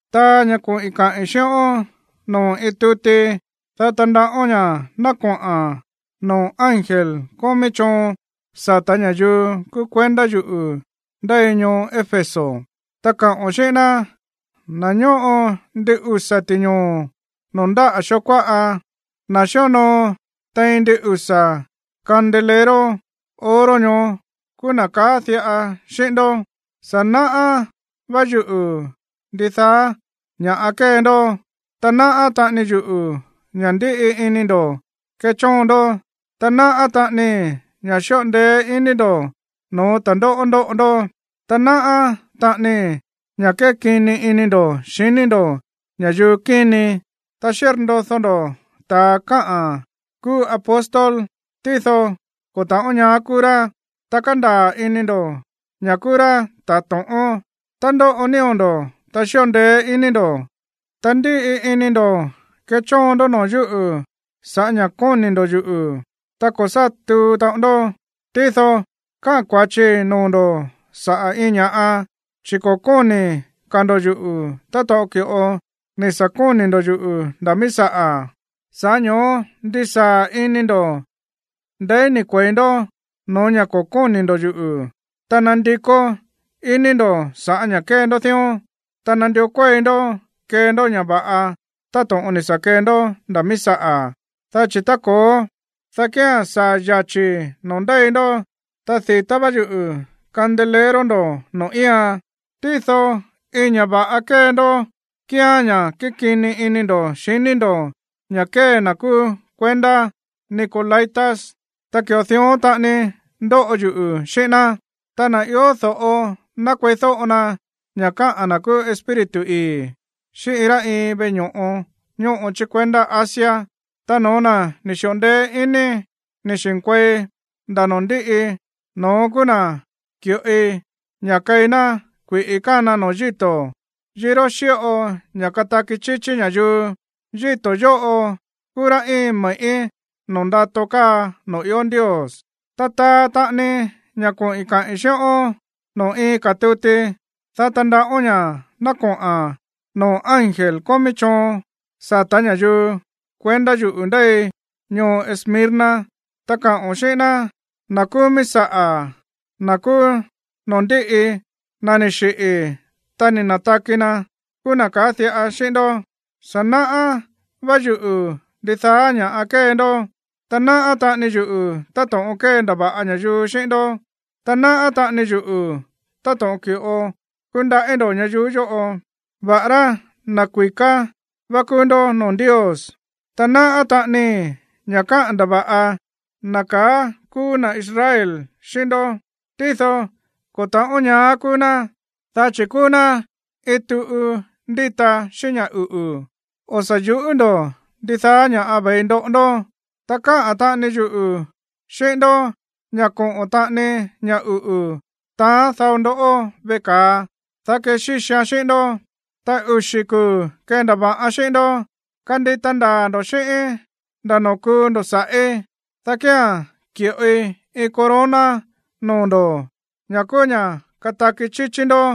’Taa ña̱ koꞌi̱n kaꞌi̱n xíꞌón noo̱ iin tuti, dá tandaꞌón ña̱ ná koꞌa̱n noo̱ ángel kómí choon sa̱tá ña̱yuu kúú kuendá yuꞌu̱ ndéi ñoo Éfeso, ta kaꞌo̱n xíꞌín ná: “Na̱ ñóꞌo ndin usa̱ ti̱ñoo̱ noo̱ ndáꞌa̱ xoo kuáꞌa, na̱ xíonoo tein ndin usa̱ candelero oro ñoó kúú na̱ kaá diꞌa xíꞌín ndó: Sa̱ náꞌá vá yuꞌu̱ ndidaá ña̱ kée ndoꞌó, ta náꞌá taꞌani yuꞌu̱ ña̱ ndíꞌi ini ndo̱ kéchóon ndó, ta náꞌá taꞌanii ña̱ xíꞌo ndeé iní ndo̱ no̱ó ta̱ndóꞌó ndóꞌo ndó. Ta náꞌá taꞌanii ña̱ kékini ini ndo̱ xiní ndo̱ ña̱yuu kíni. Ta xírndodó ndó ta̱a kaá kúú apóstol, tído ko̱ ta̱ꞌón ñaá kúú rá, ta kándaa̱ ini ndo̱ ña̱ kúú rá ta̱ to̱ꞌón. Ta ndóꞌo nío̱ ndo̱, ta xíꞌo ndeé iní ndo̱, ta ndíꞌi ini ndo̱ kéchóon ndó noo̱ yúꞌu̱ sa̱ꞌá ña̱ kóni̱ ndo̱ yuꞌu̱, ta ko̱ sá tuu taꞌon ndó. Tído káꞌa̱n kua̱chii noo̱ ndo̱ saꞌa̱ iin ña̱ꞌa, chi̱ ko̱ kóni̱ ka̱ ndo̱ yuꞌu̱ táto̱ꞌon ki̱ꞌo ni̱ sa̱ kóni̱ ndo̱ yuꞌu̱ nda̱ míí saꞌa̱. Sa̱ꞌá ño̱ó ndisaa̱ ini ndo̱ ndeí ni̱ kue̱i ndó no̱ó ña̱ ko̱ kóni̱ ndo̱ yuꞌu̱, ta nandikó iní ndo̱ sa̱ꞌá ña̱ kée ndó dión. Ta nandió kuéi ndó kee ndó ña̱ va̱ꞌa táto̱ꞌon ni̱ sa̱ kee ndó nda̱ míí saꞌa̱. Dá chi̱ tá ko̱ó, dá kía̱n saa̱ yachi̱i̱ noo̱ ndéi ndó, ta di̱tá vá yuꞌu̱ candelero ndo̱ noo̱ íian. Tído iin ña̱ va̱ꞌa kée ndó kíán ña̱ kékini ini ndo̱ xiní ndo̱ ña̱ kée na̱ kúú kuendá nicolaítas, ta ki̱ꞌo dión taꞌani ndóꞌo yuꞌu̱ xíꞌín ná. Ta na̱ ió do̱ꞌo, ná kueídóꞌo na ña̱ káꞌa̱n na̱ kúú Espíritu ii̱ xíꞌín iin rá iin veꞌe ño̱ꞌo ñóꞌo chí kuendá Asia. Ta no̱ó na̱ ni̱ xi̱ꞌo ndeé iní ni̱ xi̱nkuei nda̱ noo̱ ndíꞌi, no̱ón kúú na̱ ki̱ꞌoi ña̱ keí ná kui̱ꞌi kána noo̱ yíto̱, yiró xíꞌo ña̱ kataki chíchí ña̱yuu. Ta yíto̱ yóꞌo kúú ra̱ íin me̱ꞌí noo̱ ndato káa noo̱ ió Ndios.” ’Ta taa taꞌani ña̱ koꞌi̱n kaꞌi̱n xíꞌón noo̱ iin ka̱ tuti, dá tandaꞌón ña̱ ná koꞌa̱n noo̱ ángel kómí choon sa̱tá ña̱yuu kuendá yuꞌu̱ ndéi ñoo Esmirna, ta kaꞌo̱n xíꞌín ná: “Na̱ kúú míí saꞌa̱, na̱ kúú noo̱ ndíꞌi, na̱ ni̱ xiꞌi̱, ta ni̱ na̱taki na̱ kúú na̱ kaá diꞌa xíꞌín ndó: Sa̱ náꞌá vá yuꞌu̱ ndidaá ña̱ kée ndoꞌó, ta náꞌá taꞌani yuꞌu̱ táto̱ꞌon kéndava̱ꞌa ña̱yuu xíꞌín ndó. Ta náꞌá taꞌani yuꞌu̱ táto̱ꞌon ki̱ꞌo kúndaꞌí ndo̱ ñayuú yóꞌo, va̱ꞌará na̱ kui̱ká vá kúú ndó noo̱ Ndios. Ta náꞌá taꞌanii ña̱ káꞌa̱n ndava̱ꞌa na̱ kaá kúú na̱ Israel xíꞌín ndó, tído ko̱ ta̱ꞌón ñaá kúú ná, dá chi̱ kúú ná iin tuꞌu ndíta xíꞌín ña̱ uꞌu̱. O̱ sa̱ yu̱ꞌú ndo̱ ndidaá ña̱ ve̱i ndoꞌo ndó. Ta kaá taꞌani yuꞌu̱ xíꞌín ndó ña̱ koꞌo̱n taꞌani ña̱ uꞌu̱ taán dao ndoꞌó veꞌe ka̱a, dá kexíxian xíꞌín ndó, ta uxi̱ kuu̱ kendava̱ꞌan xíꞌín ndó. Kandita ndaa̱ ndo̱ xíꞌíín nda̱ noo̱ kuu ndo̱ sa̱ꞌí, dá kía̱n ki̱ꞌoi iin corona noo̱ ndo̱, ña̱ kúú ña̱ kataki chíchí ndó.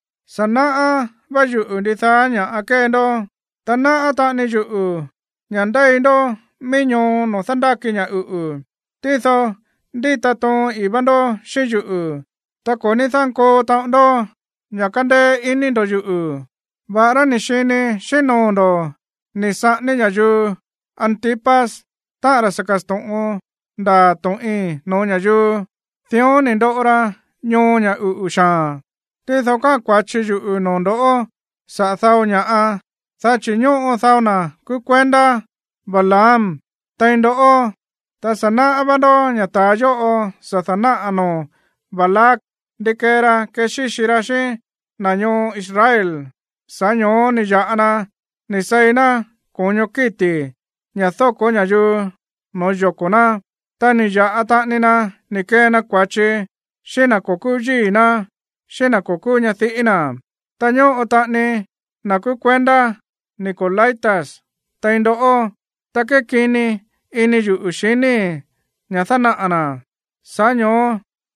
Sa̱ náꞌá vá yuꞌu̱ ndidaá ña̱ kée ndó, ta náꞌá taꞌani yuꞌu̱ ña̱ ndéi ndó mií ñoo noo̱ dándáki ña̱ uꞌu̱. Tído ndíta toon ii̱ vá ndó xíꞌín yuꞌu̱, ta ko̱ ní dánkoo taꞌon ndó ña̱ kándéé iní ndo̱ yuꞌu̱, va̱ꞌará ni̱ xini xíꞌín noo̱ ndo̱ ni̱ saꞌání ña̱yuu Antipas, táꞌa̱n ra̱ sa̱ ka̱sto̱ꞌon ndaa̱ to̱ꞌin no̱ó ña̱yuu. Dión ni̱ ndoꞌo ra ñoo ña̱ uꞌu̱ xaa̱n. Tído káꞌa̱n kua̱chi yuꞌu̱ noo̱ ndo̱ saꞌa̱ dao ña̱ꞌa, dá chi̱ ñóꞌo dao na̱ kúú kuendá Balaam tein ndoꞌó. Ta sa̱ náꞌá vá ndó ña̱ ta̱a yóꞌo sa̱ da̱náꞌa̱ noo̱ Balac ndi kee ra kexíxi ra xíꞌín na̱ ñoo Israel, sa̱ꞌá ño̱ó ni̱ ya̱ꞌa na ni̱ seí ná ko̱ño kíti̱, ña̱ dóko̱ ña̱yuu no̱ó yoko̱ ná, ta ni̱ ya̱ꞌa taꞌani na ni̱ kee na kua̱chi xíꞌín na̱ ko̱ kúú yíi̱ ná, xíꞌín na̱ ko̱ kúú ñadiꞌí na̱. Ta ñóꞌo taꞌani na̱ kúú kuendá nicolaítas tein ndó, ta kékini ini yuꞌu̱ xiníi̱ ña̱ dánaꞌa̱ na̱. Sa̱ꞌá ño̱ó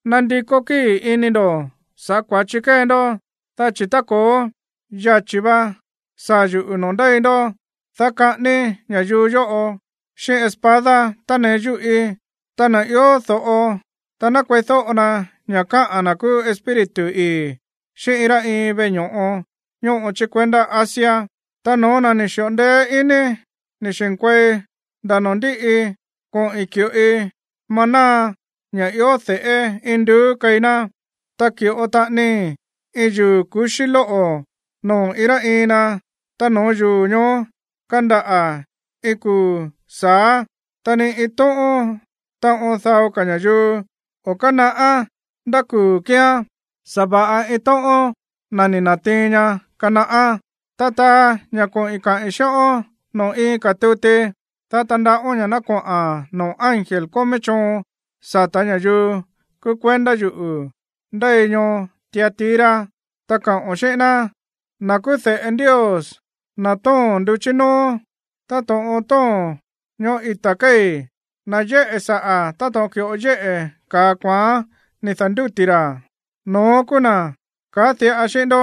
nandikó kíi̱ ini ndo̱ sa̱ꞌá kua̱chi kée ndó, dá chi̱ tá ko̱ó, yachi̱ va saa̱ yuꞌu̱ noo̱ ndéi ndó, dá kaꞌáníí ña̱yuu yóꞌo xíꞌín espada tánee yúꞌí. Ta na̱ ió do̱ꞌo, ná kueídóꞌo na ña̱ káꞌa̱n na̱ kúú Espíritu ii̱ xíꞌín iin rá iin veꞌe ño̱ꞌo ñóꞌo chí kuendá Asia. Ta no̱ó na̱ ni̱ xi̱ꞌo ndeé iní ni̱ xi̱nkuei nda̱ noo̱ ndíꞌi, koꞌi̱n ki̱ꞌoi maná, ña̱ ió de̱ꞌé induú, keí ná, ta ki̱ꞌo taꞌanii iin yuu̱ kuxí lóꞌo̱ noo̱ iin rá iin na, ta noo̱ yuu̱ ñoó kandaꞌa̱ iin kuu̱ sa̱á. Ta ni iin tóꞌón taꞌon dao ka̱ ña̱yuu o̱ kánaꞌá ndá kuu̱ kíán, sa̱va̱ꞌa iin tóꞌón na̱ ni̱ na̱tiin ña kanaꞌá.” ’Ta taa ña̱ koꞌi̱n kaꞌi̱n xíꞌón noo̱ iin ka̱ tuti, dá tandaꞌón ña̱ ná koꞌa̱n noo̱ ángel kómí choon sa̱tá ña̱yuu kúú kuendá yuꞌu̱ ndéi ñoo Tiatira, ta kaꞌo̱n xíꞌín ná: “Na̱ kúú de̱ꞌe Ndios, na̱ tóo̱n nduchí nóó táto̱ꞌon tóo̱n ñoꞌó ita̱ kéi̱, na̱ yéꞌe̱ saꞌa̱ táto̱ꞌon ki̱ꞌo yéꞌe̱ ka̱a kuaán ni̱ da̱ndúti̱ ra̱, no̱ón kúú na̱ kaá diꞌa xíꞌín ndó: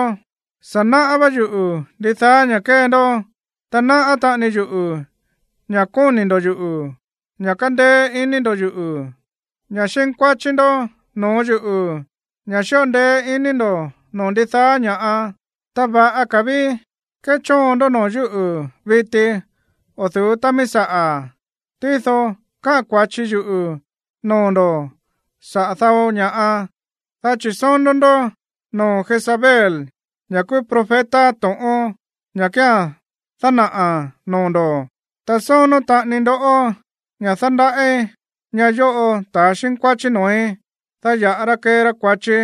Sa̱ náꞌá vá yuꞌu̱ ndidaá ña̱ kée ndó, ta náꞌá taꞌani yuꞌu̱ ña̱ kóni̱ ndo̱ yuꞌu̱, ña̱ kándéé iní ndo̱ yuꞌu̱, ña̱ xínkuáchí ndó no̱ó yuꞌu̱, ña̱ xíꞌo ndeé ini ndo̱ noo̱ ndidaá ña̱ꞌa. Ta va̱ꞌa ka̱ ví kéchóon ndó noo̱ yúꞌu̱ viti o̱ du̱ú tá míí saꞌa̱. Tído káꞌa̱n kua̱chi yuꞌu̱ noo̱ ndo̱ saꞌa̱ dao ña̱ꞌa, dá chi̱ sónó ndó noo̱ Jezabel, ñá kúú profeta to̱ꞌón, ñá kía̱n dánaꞌa̱n noo̱ ndo̱. Ta sónó taꞌani ndó ña̱ dándaꞌí ñáꞌa̱ yóꞌo ta̱ xínkuáchí noo̱í, dá ya̱ꞌa ra kee ra kua̱chi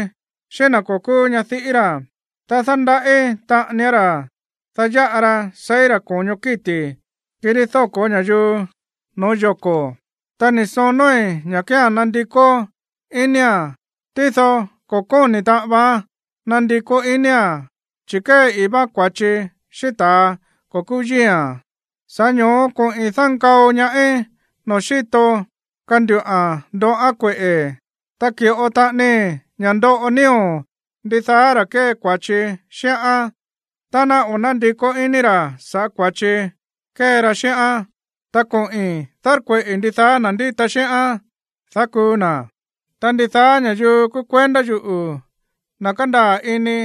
xíꞌín na̱ ko̱ kúú ñadiꞌí ra̱. Ta dándaꞌí taꞌanián ra̱, dá ya̱ꞌa ra seí ra̱ ko̱ño kíti̱, kirí dóko̱ ña̱yuu no̱ó yoko̱. Ta ni̱ sonóí ña̱ kía̱n ná nandikó inía̱n, tído ko̱ kóni̱ taꞌan vaán nandikó inía̱n, chi̱ kée ii̱ váán kua̱chi xíꞌín ta̱a ko̱ kúú yíi̱a̱n. Sa̱ꞌá ño̱ó koꞌi̱n dánkao ñaáí noo̱ xíto kanduꞌa̱n ndoꞌán kueꞌe̱, ta ki̱ꞌo taꞌanii ña̱ ndoꞌo nío̱ ndidaá ra̱ kée kua̱chi xíꞌán tá ná o̱ nándikó iní ra̱ sa̱ꞌá kua̱chi kée ra xíꞌán. Ta koꞌi̱n dárkueꞌi̱ ndidaá na̱ ndíta xíꞌán, dá kuu na̱. Ta ndidaá ña̱yuu kúú kuendá yuꞌu̱ ná kandaa̱ ini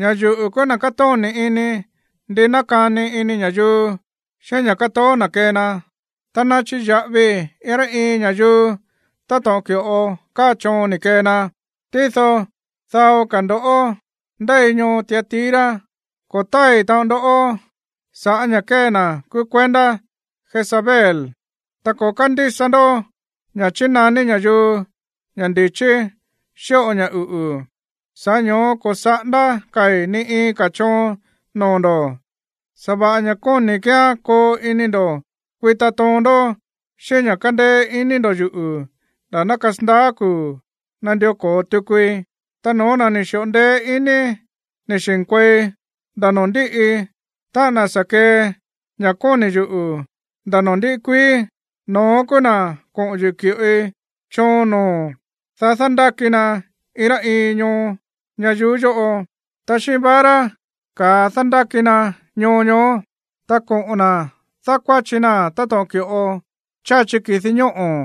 ña̱ yuꞌu̱ kúú na̱ kátóni̱ ini ndi nákani ini ña̱yuu xíꞌín ña̱ kátoó na̱ kee na, ta ná chiya̱ꞌavii iin rá iin ña̱yuu táto̱ꞌon ki̱ꞌo káa choon ni̱ kee na. ’“Tído dao ka̱ ndo̱ꞌó ndéi ñoo Tiatira, ko̱ tái̱ taꞌon ndó sa̱ꞌá ña̱ kée na̱ kúú kuendá Jezabel, ta ko̱ kándísa ndó ña̱ chínaní ña̱yuu ña̱ ndi̱chí xíꞌo ña̱ uꞌu̱. Sa̱ꞌá ño̱ó ko̱ saꞌándá ka̱i̱ ni iin ka̱ choon noo̱ ndo̱. Sa̱va̱ꞌa ña̱ kóni̱i̱ kíán koo ini ndo̱ kuita toon ndó xíꞌín ña̱ kándéé iní ndo̱ yuꞌu̱ nda̱ ná kasandaá kuu̱ nandió ko̱o tukui. Ta no̱ó na̱ ni̱ xi̱ꞌo ndeé iní ni̱ xi̱nkuei nda̱ noo̱ ndíꞌi, táꞌa̱n na̱ sa̱ kee ña̱ kóni̱ yuꞌu̱ nda̱ noo̱ ndíꞌi kuií, no̱ón kúú na̱ koꞌo̱n yuꞌu̱ ki̱ꞌoi choon noo̱, dá dándáki na iin rá iin ñoo ñayuú yóꞌo. Ta xíꞌín vara ka̱a dándáki na ñoo ñoó, ta koꞌo̱n na̱ dákuáchi naa̱n táto̱ꞌon ki̱ꞌo cháchi ki̱di ñóꞌo̱,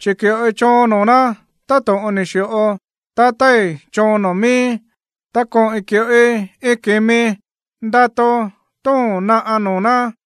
chi̱ ki̱ꞌoi choon noo̱ ná táto̱ꞌon ni̱ xi̱ꞌo tatái̱ choon noo̱ miíí, ta koꞌi̱n ki̱ꞌoi iin ki̱mi ndato tóo̱n naꞌa̱ noo̱ ná.